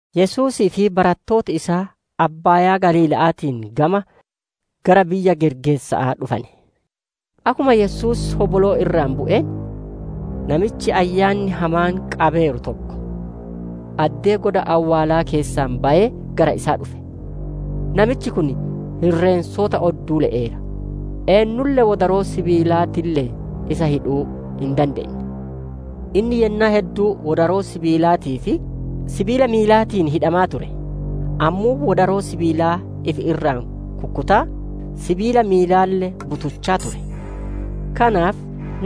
Yesuusii fi barattooti isaa Abbaayaa Galiila'aatiin gama, gara biyya Gergeesa'aa dhufane. Akkuma Yesuus hoboloo irraa bu'een, namichi ayyaanni hamaan qabeeru tokko addee goda awwaalaa keessaa bayee gara isaa dhufe. Namichi kun irreensota odduu le'eera; eennulle wodaroo sibiilaatiille'een isa hidhuu hin dandeenne. Inni yennaa hedduu wodaroo sibiilaatii fi sibiila miilaatiin hidhamaa ture; ammoo wodaroo sibiilaa ifi irraa kukkutaa, sibiila miilaalle butuchaa ture. Kanaaf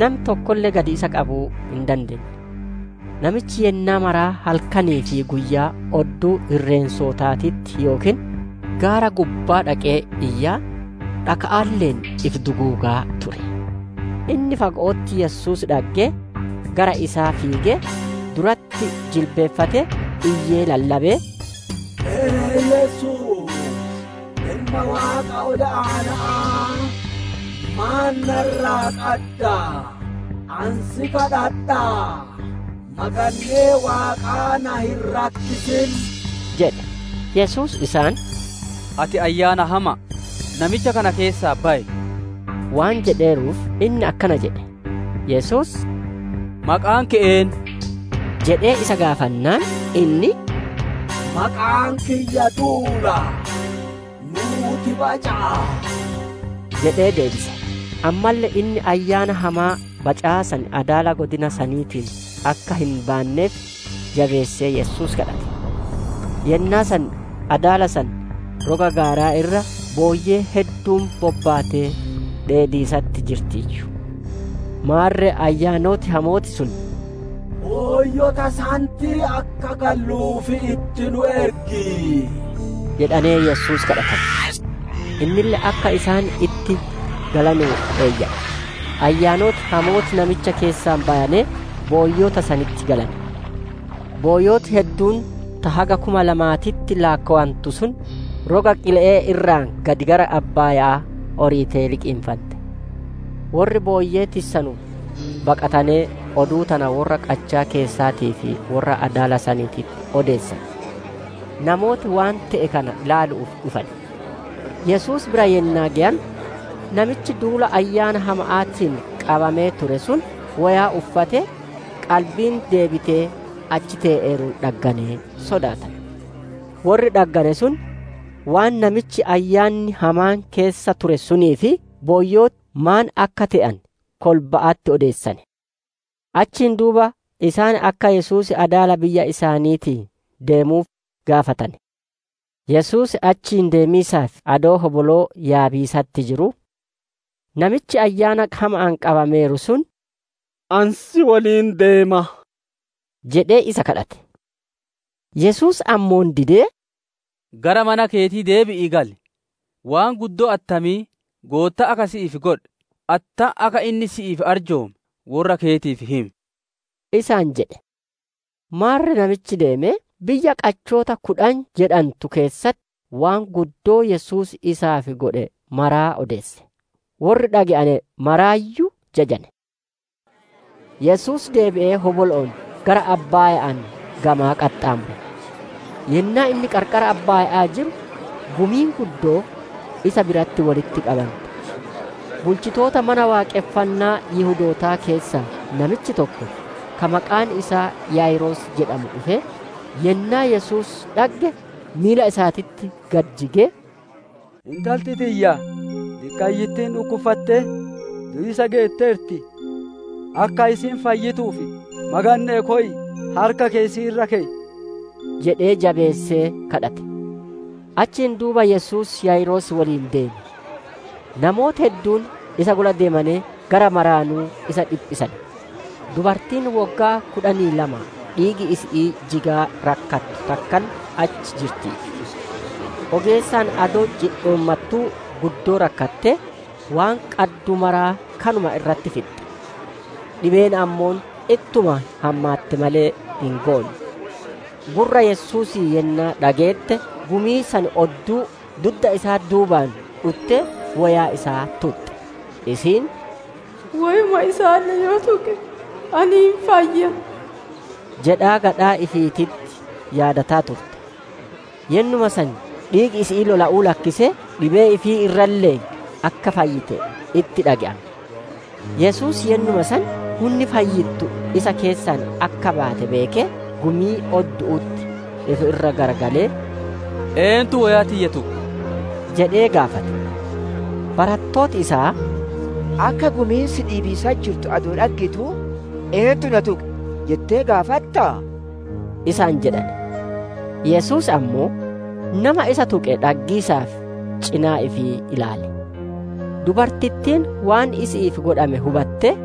nami tokkolle gad isa qabuu hin dandeenne. Namichi yennaa maraa halkanii fi guyyaa odduu irreensotaatitti yookiin gaara gubbaa dhaqee iyyaa, dhakaalle'een ifi duguugaa ture. Inni fago'otti Yesuus dhaggee, gara isaa fiigee, duratti jilbiiffatee, iyyee lallabee, «E! Yesuus Ilma Waaqa Ol Aana'aa! Maan na irraa qadda? Ani si kadhadhaa, magannee Waaqaa na hin rakkisin!» jedhe. Yesuus isaan, «Ati ayyaana hama'a, namicha kana keessaa bayi!» waan jedheeruuf, inni akkana jedhe. Yesuus, «Maqaan keeti eennu?» jedhee isa gaafate. Innille, «Maqaan kiyya duula; nuuti baca'a» jedhee deebise. Ammalle inni ayyaana hamaa bacaa san adaala godina saniitii akka hin baanneef, jabeessee Yesuus kadhate. Yennaa san, adaala san roga gaaraa irra, booyyeen hedduun bobbaatee dheediisatti jirtiiyyu. Maarre ayyaanoti hamooti sun, «Booyyota sanitti akka galluuf itti nu ergi!» jedhanee Yesuus kadhatane. Innille akka isaan itti galanuuf eeyyame. Ayyaanoti hamooti namicha keessaa bayanee booyyota sanitti galane. Booyyoti hedduun ta haga kuma lamaaniititti laakkowantu sun, roga qile'ee irraa gad gara abbaaya'aa oriitee liqinfante. Worri booyyee tissanu baqatanee, oduu tana worra qachaa keessaatii fi worra adaala saniititti odeessane. Namooti waan te'e kana ilaalu'uuf dhufane. Yesuus bira yennaa geyane, namichi duula ayyaana hama'aatiin qabamee ture sun woyaa uffatee, qalbiin deebitee achi te'eeruun dhagganee sodaatane. Worri dhaggane sun, waan namichi ayyaanni hamaan keessa ture sunii fi booyyoti maan akka te'ane kolba'atti odeessane. Achiin duuba isaan akka Yesuus adaala biyya isaaniitii deemuuf gaafatane. Yesuus achii deemiisaaf adoo hoboloo yaabiisatti jiruu, namichi ayyaana hama'aan qabameeru sun, «Ani si woliin deema» jedhee isa kadhate. Yesuus ammoo didee, «Gara manaa keetii deebi'ii gali; waan guddoo attamii Goottaan akka si'iif godhe, attam akka inni si'iif arjoome worra keetiif himi!» isaan jedhe. Maarre namichi deemee, biyya qachoota kudhan jedhantu keessatti, waan guddoo Yesuus isaaf godhe maraa odeesse. Worri dhage'ane martinuu jajane. Yesuus deebi'ee hobolo'oon gara abbaaya'aan gamaa qaxxaamure. Yennaa inni qarqara abbaaya'aa jiru, gumiin guddoon isa biratti wolitti qabante. Bulchitoota Mana Waaqonfannaa Yihudootaa keessaa namichi tokko, ka maqaan isaa Yaayiroos jedhamu dhufee, yennaa Yesuus dhagge, miila isaatitti gad jigee, «Intalti tiyya diqqayyittiin dhukkuffattee du'iisa geetteerti. Akka isiin fayyituuf maganne'ee koyiitii harka keeti isii irra keyi!» jedhee jabeessee kadhate. Achiin duuba Yesuus Yaayiroos woliin deeme. Namooti hedduun isa gula deemanee gara maraanuu isa dhiphisane. Dubartiin woggaa kudhanii lamaa dhiigi isi'ii jigaa rakkattu takkalle achi jirtiiyyu. Ogeessaan adoo cidhoommattuu guddoo rakkattee, waan qaddu maraa kanuma irratti fixxe. Dhibeen ammoo ittuma hammaatte malee hin goonne. Gurra Yesuusii yennaa dhageette, gumii san odduu, dudda isaa duubaan dhuttee woyaa isaa tuxxe. Isiin, «Woyuma isaalle yoo tuqe ani hin fayya» jedhaa gadhaa ifiititti yaadataa turte. Yennuma san dhiigi isi'ii lola'uu lakkisee, dhibee ifii irralle'ee akka fayyite itti dhage'ame. Yesuus yennuma san hunni fayyittu isa keessaa akka baate beekee, gumii oddu'utti ifi irra garagalee, «Eentu woyaa tiyya tuqe?» jedhee gaafate. Barattooti isaa, «Akka gumiin si dhiibiisatti jirtu adoo dhaggituu, ‹Eentu na tuqe?› jettee gaafattaa?» isaan jedhane. Yesuus ammoo nama isa tuqe dhaggiisaaf cinaa ifii ilaale. Dubartittiin waan isi'iif godhame hubattee,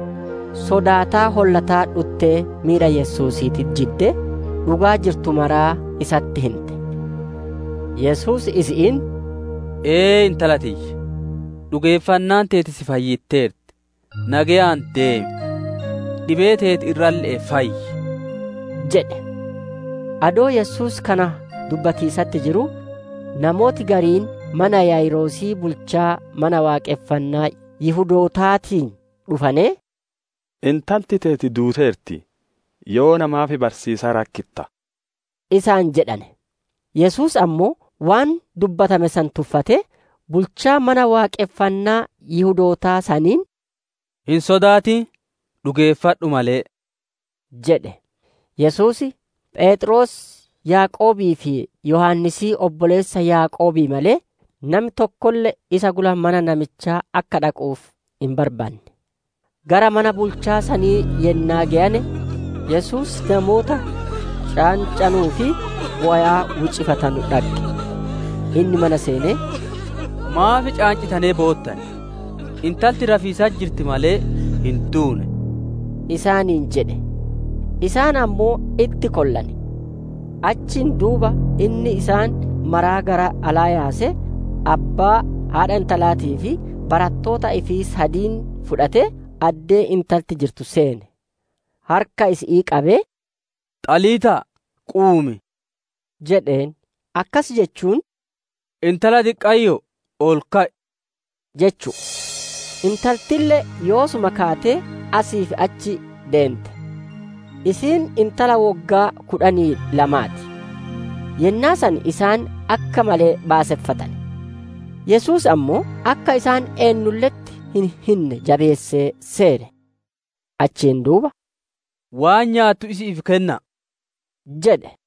sodaataa hollataa dhuttee miila Yesuusiititti jiddee, dhugaa jirtu maraa isatti hinte. Yesuus isi'iin, «Ee intala tiyya, dhugeeffannaan teeti si fayyitteerti; nageyaan deemi; dhibee teeti irralle'ee fayyi» jedhe. Adoo Yesuus kana dubbatiisatti jiruu, namooti gariin mana Yaayiroosii bulchaa Mana Waaqonfannaa Yihudootaatii dhufanee, «Intalti teeti duuteerti. Yoona maaf barsiisaa rakkitta?» isaan jedhane. Yesuus ammoo, waan dubbatame san tuffatee, bulchaa Mana Waaqonfannaa Yihudootaa saniin, «Hin sodaatin, dhugeeffadhu malee!» jedhe. Yesuus: Pheexroos, Yaaqoobii fi Yohaannisii obboleessa Yaaqoobii malee, nami tokkolle isa gula mana namichaa akka dhaquuf hin barbaanne. Gara mana bulchaa sanii yennaa geyane, Yesuus namoota caancanuu fi bowaa wiiccifatanu dhagge. Inni mana seenee, «Maaf caancitanee boottan? Intalti rafiisatti jirti malee, hin duune» isaaniin jedhe. Isaan ammoo itti kollane. Achiin duuba inni isaan maraa gara alaa yaasee, abbaa, haadha intalaatii fi barattoota ifii sadiin fudhatee, addee intalti jirtu seene. Harka isi'ii qabee, «Xaliitaa quumii!» jedheen; akkas jechuun «Intala diqqayyoo! Ol ka'i!» jechu'u. Intaltille yoosuma kaatee asii fi achi deente. Isiin intala woggaa kudhanii lamaa ti. Yennaa san isaan akka malee baaseffatane. Yesuus ammoo, akka isaan eennulle'etti hin hinne jabeessee seere. Achiin duuba «Waan nyaattu isi'iif kenna'a!» jedhe.